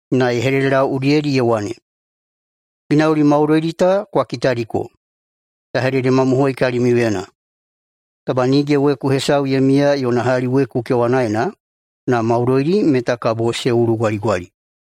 Na ye hededelau udiyedi ye wane, “Ginauli maudoidi ta kwa kitadiko. Ya hededemamohoi kalimiuyena: Taba nige weku hesau ye miya yona hali weku kewanaena, na maudoidi meta kabo se ulugwaligwali.”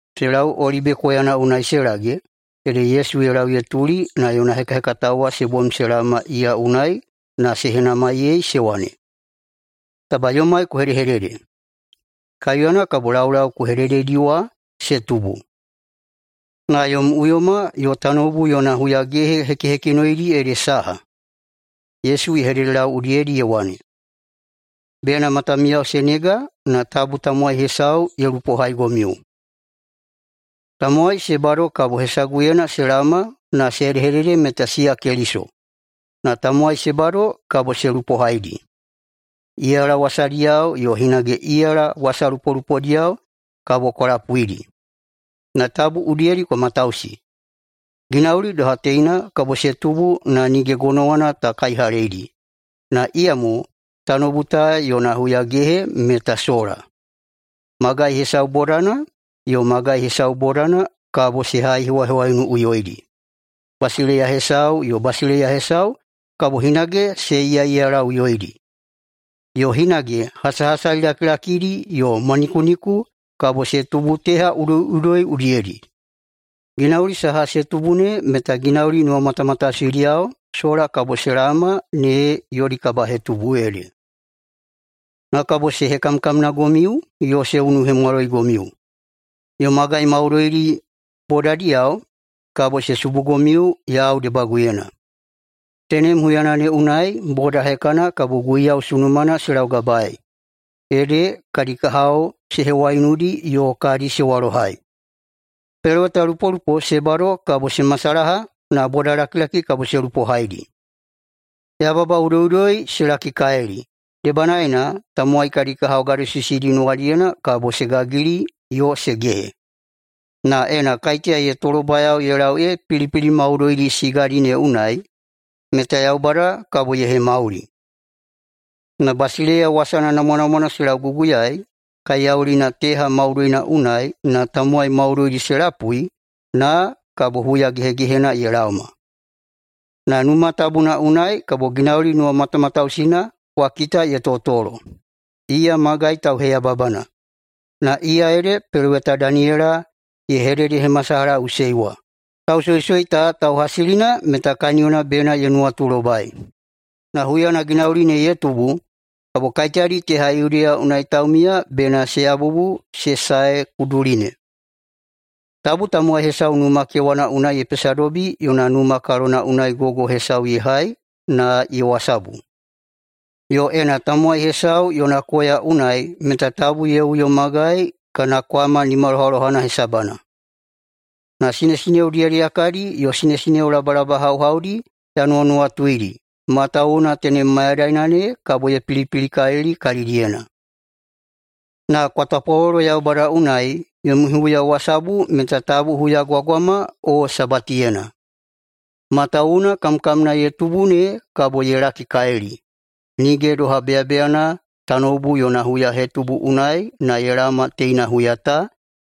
Se lau Olibe koyana unai se lage, ede Yesu ye lau ye tuli na yona hekahekatao wa se bom se laoma iya unai na se henamaiyei se wane, “Taba yomai ku hedehedede, kaiuyana kabo laulau ku hedededi wa se tubu, na yom uyoma yo tanoubu yona huyagehe hekihekinoidi ede saha?” Yesu ye hededelau udiyedi ye wane, “Bena matamiyao se nega na tabu tamowai hesau ye lupohaigomiu. Tamowai se bado kabo hesaguyena se laoma na se hedehedede meta siya Keliso, na tamowai se bado kabo se lupohaidi. Iyala wasadiyao yo hinage iyala wasalupolupodiyao kabo kwa lapuidi, na tabu udiyedi kwa matausi. Ginauli doha teina kabo se tubu na nige gonowana ta kaihaleidi, na iyamo tanoubu ta yona huyagehe meta sola. Magai hesau bodana yo magai hesau bodana kabo se haihewahewaiunuꞌuyoidi. Basileiya hesau yo basileiya hesau kabo hinage se iyaꞌiyalaꞌuyoidi. Yo hinage hasahasali lakilakidi yo mwanikuniku kabo se tubu teha udoiꞌudoi udiyedi. Ginauli saha se tubu ne meta ginauli nuwamatamatausidiyao sola kabo se laoma ne yodi kabahetubu ede. Na kabo se hekamkamnagomiu yo se unuhemwaloigomiu, yo magai maudoidi bodadiyao kabo se subugomiu yau debaguyena. Tenem huyana ne unai boda hekana kabo Guiyau sunumana se laugabaei, ede kadi kahao se hewaiunudi yo kadi se walohai. Pelowetalupolupo se bado kabo se masalaha na bodalakilaki kabo se lupohaidi. Yababa udoiꞌudoi se lakikalili, debanaena tamowai kadi kahao gadosisidi nuwadiyena kabo se gagili yo se gehe. Na ena kaiteya ye tolobayao ye lau ee pilipili maudoidi sigadi ne unai, meta Yaubada kabo ye hemauli. Na basileiya wasana namwanamwana se lauguguyaei kaiyaulina teha maudoina unai na tamowai maudoidi se lapui, na kabo huya gehegehena ye laoma. Na Numa Tabuna unai kabo ginauli nuwamatamatausina kwa kita ye totolo, iya magai tauheyababana, na iya ede peloweta Daniyela ye hededehemasalahaꞌusei wa – lausoisoi ta tauhasilina meta kaniyona bena ye nuwatulobai. Na huyana ginauli ne ye tubu kabo kaiteyadi teha Yudeya unai taumiya bena se yabubu se sae kuduli ne. Tabu tamowai hesau numa kewana unai na ye pesadobi yona numa kalona unai gogo saha hesau ye hai na ye wasabu. Yo ena tamowai hesau yona koya unai meta tabu ye uyo magai kana kwama nimalohalohana hesabana. Na sinesineo diyadiyakadi yo sinesineo labalabahauhaudi ya nuwanuwatuidi, [matawuwuna tenem mayadaina ne kabo ye pilipilikalili kalidiyena.] Na kwa tapwalolo [Yaubada unai] yomi huyawasabu meta tabu huyagwagwama o Sabatiyena. Matawuwuna kamkamna ye tubu ne kabo ye lakikalili, nige doha beyabeyana tanoubu yona huyatubu unai ye laoma teina huya ta,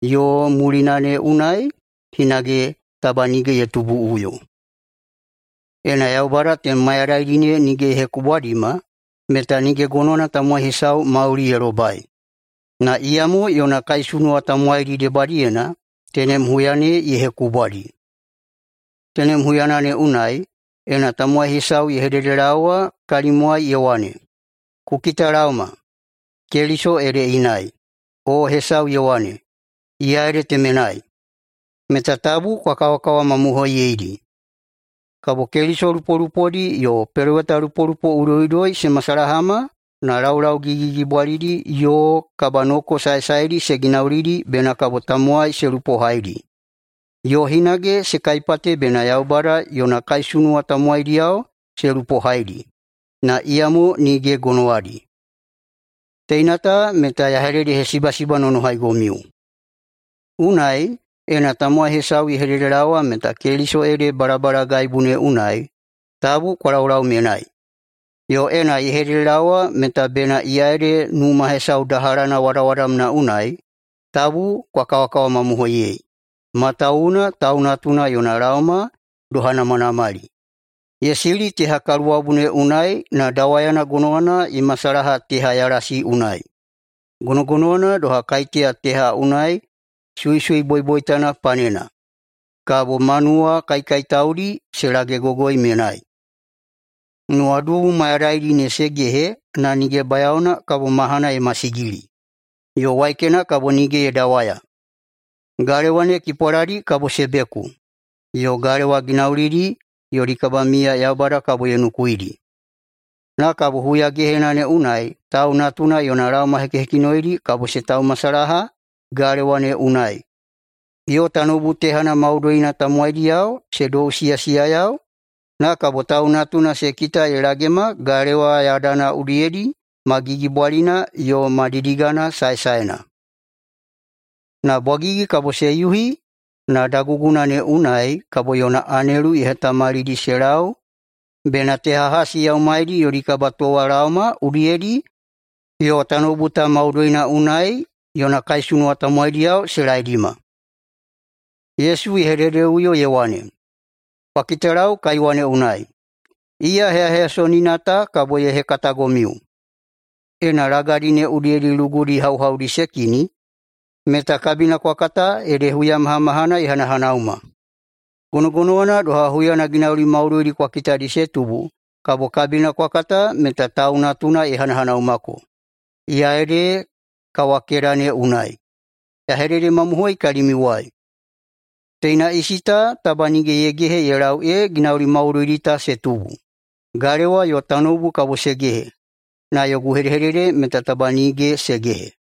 yo mulina ne unai hinage taba nige ye tubuꞌuyo. Ena Yaubada tenem mayadaidi ne nige ye hekubwadima, meta nige gonowana tamowai hesau mauli ye lobai. Na iyamo yona kaisunuwa tamowaidi debadiyena tenem huya ne ye hekubwadi. Tenem huyana ne unai, ena tamowai hesau ye hededelaowa kalimiuwai ye wane, ‘Kwa kitalaoma, Keliso ede inai!’, o hesau ye wane, ‘Iya ede temenai!’, meta tabu kwa kawakawamamohoiyeidi. Kabo keliso lupolupodi yo pelowetalupolupo udoiꞌudoi se masalahama na laulau gigigigibwalidi yo kabanoko saesaedi se ginaulidi bena kabo tamowai se lupohaidi. Yo hinage se kaipate bena Yaubada yona kaisunuwa tamowaidiyao se lupohaidi, na iyamo nige gonowadi. Teina ta meta ya hededehesibasibanonohaigomiu. Unai, ena tamowai hesau ye hededelaowa meta Keliso ede balabalagaibu ne unai, tabu kwa laulau menai. Yo ena ye hededelaowa meta bena iya ede numa hesau dahalana wadawadamna unai, tabu kwa kawakawamamohoiyei. Matawuwuna Tau Natuna yona laoma doha namanamali, ye sili teha kaluwabu ne unai na dawayana gonowana ye masalaha teha yalasi unai. Gonogonowana doha, kaiteya teha unai suisui boiboitana panena, kabo manuwa kaikaitaudi se lagegogoi menai. Nuwadubu mayadaidi ne se gehe na nige bayaona ‘kabo mahana ye masigili yo waikena kabo nige ye dawaya, galewa ne kipwaladi kabo se beku, yo galewa ginaulidi yodi kabamiya Yaubada kabo ye nukuidi.’ Na kabo huyagehena ne unai Tau Natuna yona laoma hekihekinoidi kabo se taumasalaha galewa ne unai, yo tanoubu tehana maudoina tamowaidiyao se dousiyasiyayau, na kabo Tau Natuna se kita ye lagema galewa yadana udiyedi ma gigibwalina yo ma didigana saesaena. Na bwagigi kabo se yuhi na daguguna ne unai kabo yona anelu ye hetamalidi se lau bena teha hasi yaumaidi yodi kabatowalaoma udiyedi yo tanoubu ta maudoina unai yona kaisunuwa tamowaidiyao se laedima.” [Yesu ye hededeꞌuyo ye wane,] “Kwa kitalau kaiwa ne unai, iya heyaheyasonina ta kabo ye hekatagomiu: Ena lagadi ne udiyedi lugudi hauhaudi se kini meta kabina kwa kata ede huyamahamahana ye hanahanauma. Gonogonowana doha huyana ginauli maudoidi ta kwa kitadi se tubu, kabo kabina kwa kata meta [Tau Natuna] ye hanahanaumako, iya ede kawakeda ne unai. Ya hededemamohoi kalimiuwai: Teina isi ta taba nige ye gehe ye lau ee ginauli maudoidi ta se tubu. Galewa yo tanoubu kabo se gehe, na yogu hedehedede meta taba nige se gehe.”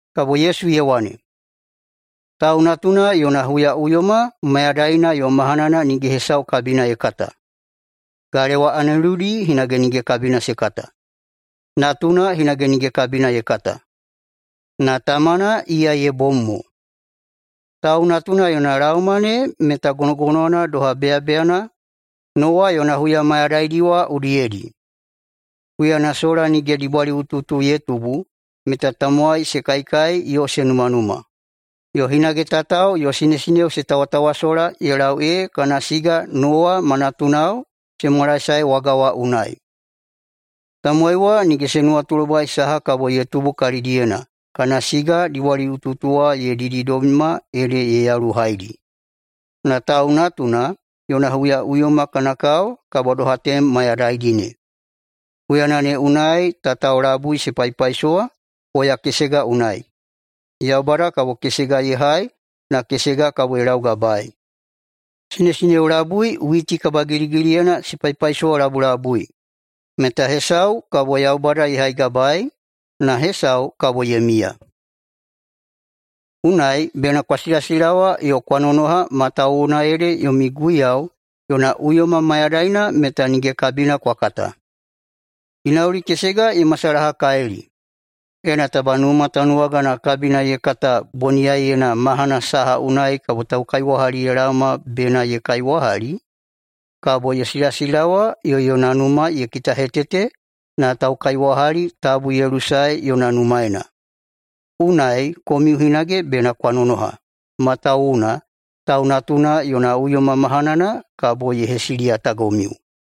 [Kabo Yesu ye wane], “[Tau Natuna yona huyaꞌuyoma] mayadaina yo mahanana nige hesau kabina ye kata, galewa aneludi hinage nige kabina se kata, Natuna hinage nige kabina ye kata, na Tamana iya ye bom mo. Tau Natuna yona laoma ne meta gonogonowana doha [beyabeyana] Nowa yona huya mayadaidi wa udiyedi. Huyana sola nige dibwaliꞌutuꞌutu ye tubu meta tamowai se kaikai yo se numanuma, yo hinage tatao yo sinesineo se tawatawasola ye lau ee kana siga Nowa [ma natunao] se mwalaesae waga wa unai. Tamowai wa nige se nuwatulobai saha kabo ye tubu kalidiyena kana siga dibwaliꞌutuꞌutu wa ye dididobima ede ye yaluhaidi. Na Tau Natuna yona huyaꞌuyoma kana kao kabo doha tenem mayadaidi ne. Huyana ne unai tatao labui se paipaisowa koya kesega unai. Yaubada kabo kesega ye hai na kesega kabo ye laugabaei. Sinesineo labui witi kabagiligiliyena se paipaisowalabulabui meta hesau kabo Yaubada ye haigabaei, na hesau kabo ye miya. Unai bena kwa silasilawa yo kwa nonoha matawuwuna ede yomi Guiyau yona uyoma mayadaina meta nige kabina kwa kata. Ginauli kesega ye masalahakalili: Ena taba numa tanuwagana kabina ye kata boniyaiyena mahana saha unai kabo taukaiwahali ye laoma bena ye kaiwahali, kabo ye silasilawa yo yona numa ye kitahetete na taukaiwahali tabu ye lusae yona numaena. Unai komiu hinage bena kwa nonoha, matawuwuna Tau Natuna yona uyoma mahanana kabo ye hesiliyatagomiu.”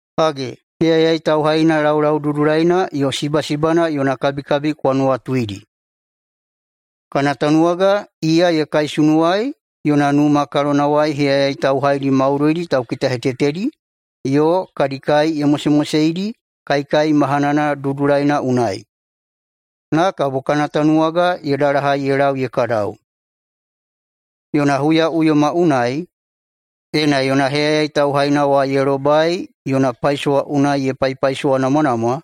“Hage, heyayai tauhaina laulaududulaina yo sibasibana yona kabikabi kwa nuwatuidi. Kana tanuwaga iya ye kaisunuwai yona numa kalonawai heyayai tauhaidi maudoidi taukitahetetedi yo kadi kai ye mosemoseidi kaikai mahanana dudulaina unai. [Na kabo kana tanuwaga ye dalahai ye lau ye kadau.] Yona huyaꞌuyoma unai, ena yona heyayai tauhaina wa ye lobai yona paisowa unai ye paipaisowanamwanamwa,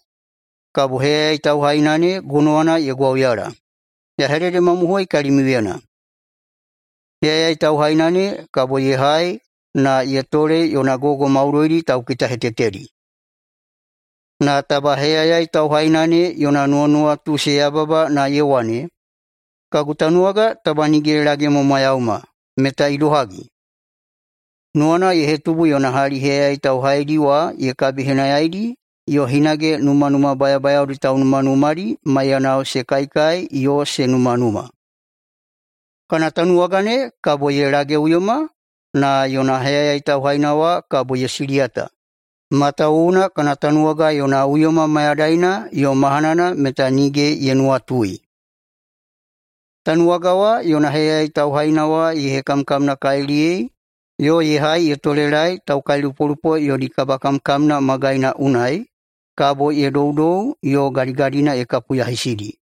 kabo heyayai tauhaina ne gonowana ye gwauyala. Ya hededemamohoi kalimiuyena: Heyayai tauhaina ne kabo ye hai na ye tole yona gogo maudoidi taukitahetetedi. Na taba heyayai tauhaina ne yona nuwanuwatu se yababa na ye wane, ‘Kagu tanuwaga taba nige ye lagemwamwayauma’, meta idohagi? Nuwana ye hetubu yona hali heyayai tauhaidi wa ye kabihenayaidi yo hinage numanuma bayabayaodi taunumanumadi maiyanao se kaikai yo se numanuma. Kana tanuwaga ne kabo ye lageꞌuyoma na yona heyayai tauhaina wa kabo [ye siliyata, matawuwuna] kana tanuwaga yona uyoma mayadaina yo mahanana meta nige ye nuwatui. Tanuwaga wa yona heyayai tauhaina wa ye hekamkamnakaliliyei yo ye hai ye tolelaei taukailupolupo yodi kabakamkamna magaina unai kabo ye doudou yo gadigadina ye kapuyahisidi.”